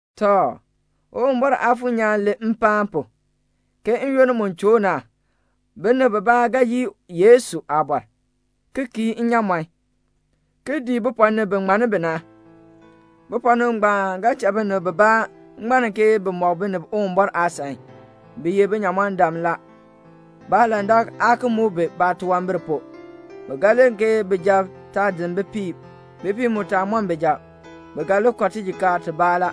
Tɔ, Uwumbɔr Aafuur nyaan len mpaan pu, ke n-yoonn mu choo na binib bibaa ga yii Yesu aabɔr, ki kii inyaamɔn, ki dii bipɔɔnib bi ŋmann bi na. Bipɔɔnib ngbaan ga cha binib bibaa ŋmann ke bi mɔk binib Uwumbɔr aasan. Bi ye binyamɔndam la. Baalandak aa ki muk bi baatunwambir pu. Bi ga len ke bijab taa din bipiib, bipiib mu taa mɔn bijab. Bi ga li kɔ tijikaar tibaa la.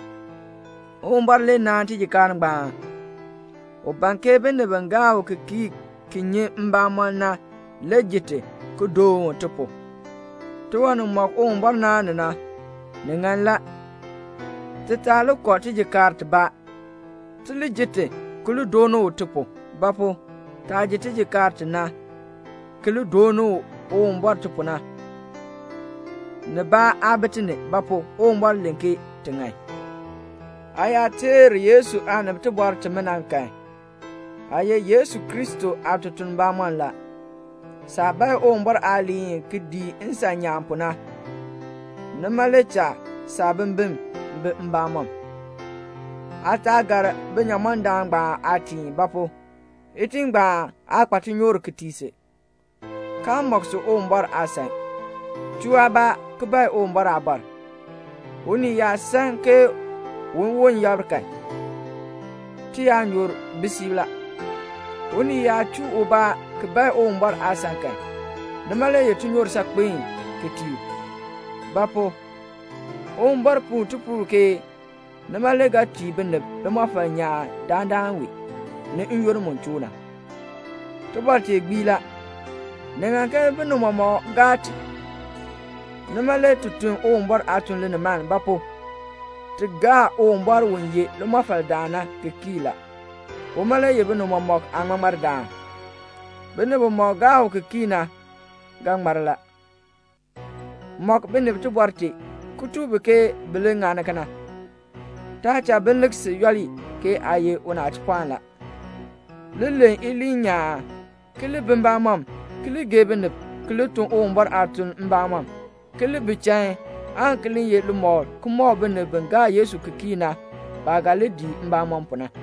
Uwumbɔr le naan tijikaar ngbaan. U ban ke binib bi gaa u ki kii ki nyi mbamɔn na le ji ti, ki doon u ti pu. Tiwan nimɔk Uwumbɔr naan ni na, ni ŋan la. Ti taa li kɔ tijikaar tibaa. Ti li ji ti, ki li dooni u ti pu. Ba pu? taah ji tijikaar ti na, ki li dooni Uwumbɔr ti pu na, nibaa aa bi ti ni; ba pu? Uwumbɔr len ke ti ŋan. Aa yaa teer Yesu aanib tibɔr timina kan, aa ye Yesu Kristo aatutuln bamɔnn la. Saah bae Uwumbɔr aaliin ki dii nsan nyaan pu na, nima le cha saabimbin bi mbamɔm. Aa taa gar binyamɔndam ngbaan aatiin; ba pu? itiin ngbaan aa kpa tinyoor ki tii si, kaa mɔk si Uwumbɔr aasan. Chuu aabaa ki bae Uwumbɔr aabɔr. Unii yaa san ke uwon yabr kan, tiyaanyoor bi siib la. Unii yaa chuu ubaa ki bae Uwumbɔr aasan kan, nima le ye tinyoor saakpen ki tii u. Ba pu? Uwumbɔr puu tipuul ke nima le ga tii binib limɔfal nyaan dandana wee, ni n-yoonn mu choo na. Tibɔr tee gbii la. Ni ŋan ke binib mɔmɔk gaa ti. Nima le ti tun Uwumbɔr aatuln linimaln; ba pu? ti gaa Uwumbɔr u ye limɔfaldaan na ki kii la. Uma le ye binib mɔmɔk aaŋmaŋmar-daan. Binib bimɔk gaa u ki kii na ga ŋmar la. Mɔk binib tibɔr tee, ki tuk bi ke bi li ŋani kena. Taa cha bi lik si yooli, ke aa ye unachipɔɔn la. Li len iliin nyaan, ki li bi mbamɔm, ki li gee binib, ki li tun Uwumbɔr aatuln mbamɔm, ki li bi chain, aan ki li ye limɔkl ki mɔk binib bi gaa Yesu ki kii na baah ga li dii mbamɔm pu na.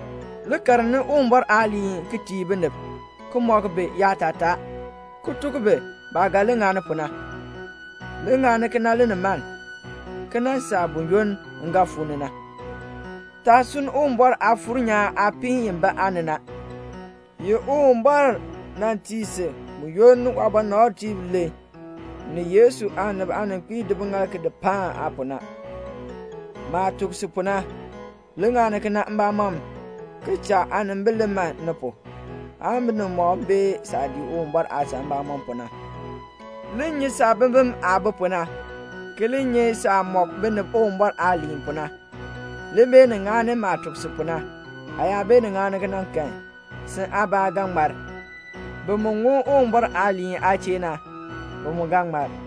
Li karni Uwumbɔr aaliin ki tii binib, ki mɔk bi yaatataa, ki tuk bi baah ga li ŋani pu na. Li ŋani kena linimaln, ki nan saa buyoonn m ga fuu ni na. Taa sunn Uwumbɔr Aafuur nyaan aapiin i bi aa ni na, i Uwumbɔr nan tii si buyoonn waabɔnabtiib len, ni Yesu aanib aaninkpiib di biŋaal ki di paan aa pu na. Maah tuk si pu na, li ŋani kena mbamɔm ki cha aanimbil li man ni pu, aan binib mɔmɔk bee saah dii Uwumbɔr aasan mbamɔm pu na. Li nyi saabimbin aah bi pu na, ki li nyi saah mɔk binib Uwumbɔr aaliin pu na. Li beenin ŋani maah tuk si pu na. Aa yaa beenin ŋani kena kan, sin aabaa ga ŋmar. Bi mu ŋun Uwumbɔr aaliin aa chee na, bi mu ga ŋmar.